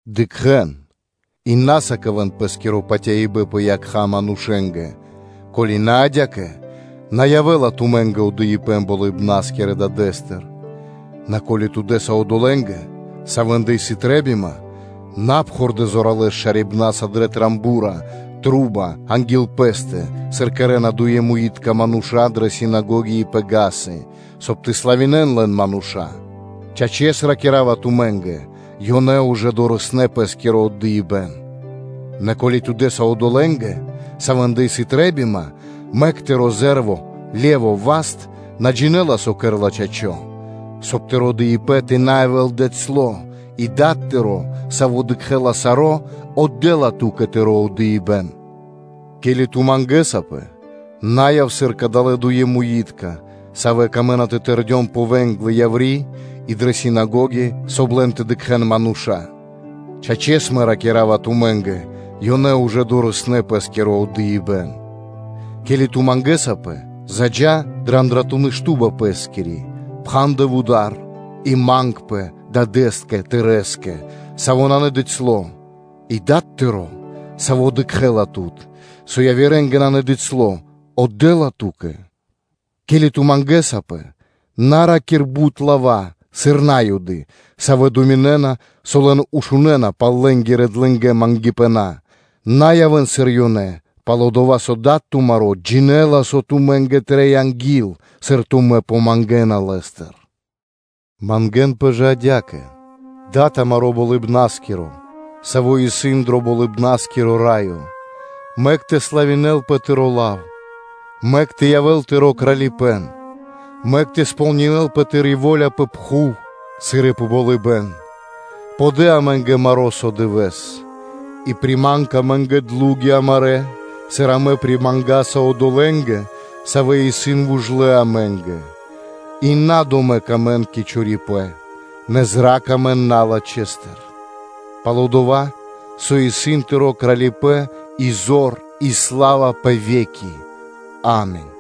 Дыкхэ́н, и на сыкавэ́н пэ́скиро патяибэ́н пэ якха́ манушэ́нгэ; ко́ли на адя́кэ, на явэ́ла тумэ́нгэ отдыибэ́н Болыбна́скирэ Дадэ́стыр. Нэ ко́ли ту дэ́са одолэ́нгэ, савэ́ндэ исын трэ́бима, на пхурдэ зоралэ́с шарибнаса дро ро́го (труба) анги́л пэ́стэ, сыр кэрэ́на дуемуитка мануша́ дрэ синагоги и пэ вули́цы (га́сы), соб (кай) тэ славинэ́н лэн мануша́. Чачэс, ракира́ва тумэ́нгэ: ёнэ ужэ дорэснэ́ пэ́скиро отдыибэ́н. Нэ ке́ли ту дэ́са одолэ́нгэ, савэ́ндэ сыс трэ́бима, мэк тыро́ зэ́рво (ле́во) васт на джинэ́ла, со кэрэ́ла чачо́ (право). Соб (кай) тыро́ дыибэ́н тэ на явэ́л дыцьло; и Дад тыро́, Саво́ дыкхэ́ла саро́, отдэ́ла ту́кэ тыро́ отдыибэ́н. Ке́ли ту мангэсапэ, на яв сыр кадалэ́ дуемуитка, савэ́ камэ́на тэ тэрдён пэ вэ́нглы яври́ и дрэ синагоги, соб (кай) лэн тэ дыкхэ́н мануша́. Чачэс, Мэ ракира́ва тумэ́нгэ: ёнэ ужэ дорэснэ́ пэ́скиро отдыибэ́н. Ке́ли ту мангэсапэ, заджа́ дрэ андратуны́ шту́ба пэ́скири, пхандэ вуда́р, и мангпэ Дадэ́скэ тырэ́скэ, Саво́ исын надыцьло; и Дад тыро́, Саво́ дыкхэ́ла тут, со явирэ́нгэ на дыцьло, отдэ́ла ту́кэ. Ке́ли ту мангэсапэ, на ра́кир бут лава́, сыр На́юды, савэ́ думинэ́на, со лэн ушунэна пал лэ́нгирэ длэнгэ мангипэна. На явэ́н, сыр ёнэ исын, пал-дова́ со Дад тумаро́ джинэ́ла, со тумэ́нгэ трэй анги́л, сыр тумэ́ помангэна Лэ́стыр. Мангэ́нпэ жэ адя́кэ: ‘Дад амаро́ Болыбна́скиро, Саво́ исын дро Болыбна́скиро Раё! Мэк тэ славинэлпэ Тыро́ лав; Мэк тэ явэ́л Тыро́ Кралипэ́н, Мэк тэ сполнинэ́лпэ Тыри́ во́ля пэ пхув, Сыр и пэ болыбэ́н; Подэ амэ́нгэ маро́ со дывэ́с; И приманг амэ́нгэ длуги амарэ́, Сыр амэ примангаса одолэ́нгэ, Савэ исын вужлэ амэ́нгэ; И на домэк амэн кэ чорипэ́н; нэ зра́кх амэн налачхэстыр; пал-дова́ со исын Тыро́ Кралипэ́н и зор и сла́ва пэ ве́ки. Ами́нь.’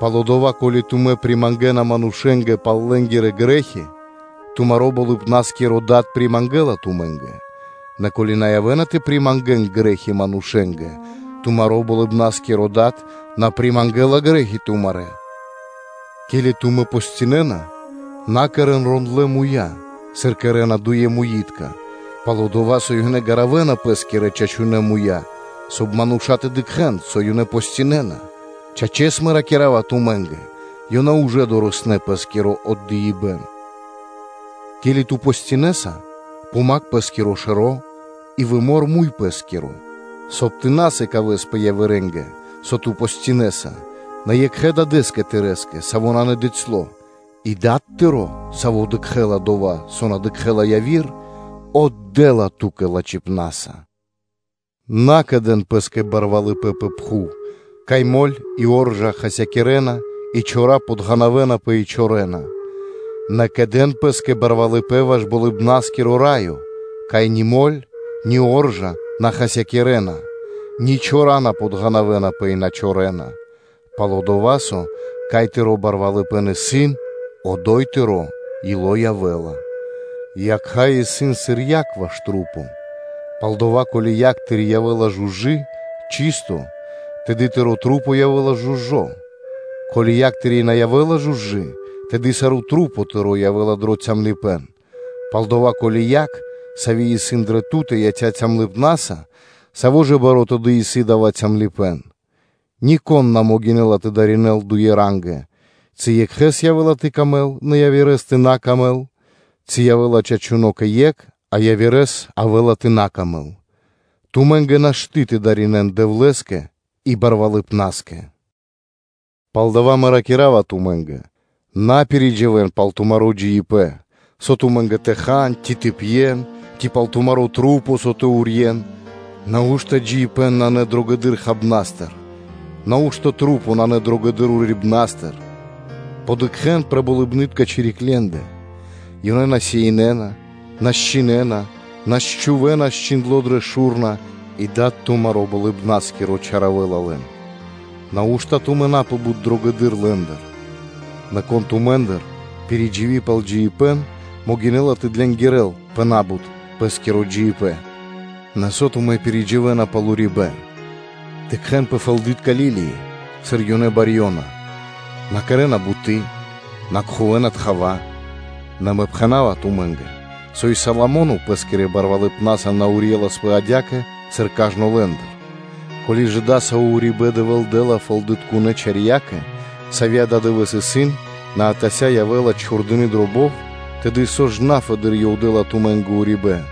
Пал-дова́, ко́ли тумэ́ примангэна манушэ́нгэ пал лэ́нгирэ грэ́хи, тумаро́ Болыбна́скиро Дад примангэла тумэ́нгэ, нэ ко́ли тумэ на явэ́на тэ примангэн грэ́хи манушэ́нгэ, тумаро́ Болыбна́скиро Дад на примангэла грэ́хи тумарэ́. Ке́ли тумэ́ постинэна, на кэрэ́н рондлэ́ муя́, сыр кэрэ́на дуемуитка, пал-дова́ со ёнэ гаравэна пэ́скирэ чачунэ́ муя́, соб (кай) мануша́ тэ дыкхэ́н, со ёнэ постинэна. Чачэс, Мэ ракира́ва тумэ́нгэ: ‘Ёнэ ужэ дорэснэ́ пэ́скиро отдыибэ́н.’ Ке́ли ту постинэса, помакх пэ́скиро шэро́ и вымор муй пэ́скиро, соб (кай) тэ на сыкавэспэ явирэ́нгэ, со ту постинэса, нэ екхэ Дадэ́скэ тырэ́скэ, Саво́ исын надыцьло; и Дад тыро́, Саво́ дыкхэ́ла дова́, со на дыкхэ́на яви́р мануша́, отдэ́ла ту́кэ лачхипна́са. На кэдэн пэ́скэ кучипэна пэ пхув, кай моль и оржа хасякирэна, и чора подґанавэнапэ и чорэна; нэ кэдэн пэ́скэ кучипэ́н ваш Болыбна́скиро Раё, кай ни моль, ни оржа на хасякирэ́ла, ни чора на подґанавэнапэ; и на чорэна; пал-дова́ со, кай тыро́ кучипэ́н исын, одо́й тыро́ ило́ явэ́ла. Якха́ исын сыр момолы́тко (свети́льнико) ваш маса́. Палдава́, ко́ли якх тыри́ явэ́ла жужы (чысто), тэды тырэ́ маса́ явэ́на жужэ́. Ко́ли якх тыри́ на явэ́ла жужы, тэды сарэ́ маса́ тырэ́ явэ́на дро цямлыпэ́н. Палдава́, ко́ли яг, сави́ исын дрэ ту́тэ, яця́ цямлыпнаса, саво́ ж баро́ тэды исын дава́ калыпэ́н (цямлыпэ́н). Нико́н на могинэ́ла тэ дынаринэ́л дуе рангэ, ци екхэ́скэ явэ́ла тэ сыкавэ́л паты́в, нэ яви́р явэ́ла на пир ило́; ци явэ́ла чачуно́ кэ екх, а кэ яви́р явэ́ла на пир ило́. Тумэ́нгэ нашты́ тэ дынаринэ́н (тэ служынэн) Дэвлэ́скэ и барвалыпнаскэ. Палдава́ Мэ ракира́ва тумэ́нгэ: на пиридживэн пал тумаро́ джиибэ́н, со тумэ́нгэ тэ хан ци тэ пьен; ци пал тумарэ́ маса́, со тэ урьен. Нау́што (хай) джиибэ́н исын на дрогэдыр хабнастыр, нау́што маса́ исын на дрогэдыр урибнастыр? Подыкхэн пэ болыбнытконэ чириклендэ; ёнэ на сеинэна, на счхинэна, на чхувэ́на счхиндло дрэ шу́рна; и Дад тумаро́ Болыбна́скиро чаравэла лэн. Нау́што тумэ́ на сан пэ бут дрогэдыр лэ́ндыр? Нэ кон тумэ́ндыр, пиридживи пал джиибэ́н, могинэ́ла тэ кэрэ́л длэнгэдыр пэ на́бут пэ́скиро джиибэ́н? Нэ со тумэ́ пиридживэна пал урибэ́н? Дыкхэ́н пэ фэлды́тка лилии, сыр ёнэ барьёна; на кэрэ́на буты́, на кхувэна тхава, нэ Мэ пхэна́ва тумэ́нгэ, со и Соломо́но пэ́скирэ барвалыпнаса на урьеласпэ адя́кэ, сыр кажно лэ́ндыр. Ко́ли ж дасаво урибэ́н Дэвэ́л дэ́ла фэлдытконэ чарьякэ, сави́ ададывэ́с исын, нэ атася́ явэ́ла чхурдыи дро бов, тэды со ж на фэды́р Ёв дэ́ла тумэ́нгэ урибэ́н,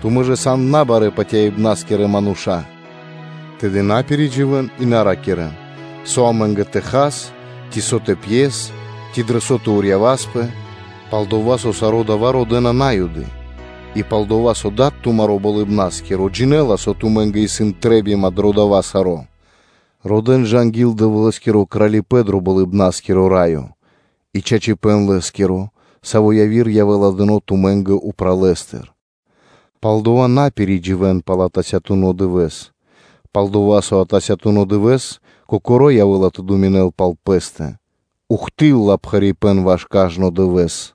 тумэ́ ж сан набарэ́ – патяибнаскирэ мануша́? Тэды на пиридживэн, и на ракирэ́н: ‘Со амэ́нгэ тэ хас?’ ци ‘Со тэ пьяс, ци дро со тэ урьяваспэ?’ Пал-дова́ со саро́ дава́ родэ́на На́юды, и пал-дова́ со Дад тумаро́ Болыбна́скиро джинэ́ла, со тумэ́ндэ исын трэ́бима дро дава́ саро́. Родэ́н жа анги́л Дэвлэ́скиро Кралипэ́н дро Болыбна́скиро Раё и чачипэ́н Лэ́скиро, саро́ яви́р явэ́ла дыно́ тумэ́нгэ упралэстыр. Палдова́ на пиридживэн пал атасятуно дывэ́с, пал-дова́ со атасятуно дывэ́с кокоро́ явэ́ла тэ думинэл пал пэ́стэ; ухты́лла (до́си) пхарипэ́н ваш кажно дывэ́с.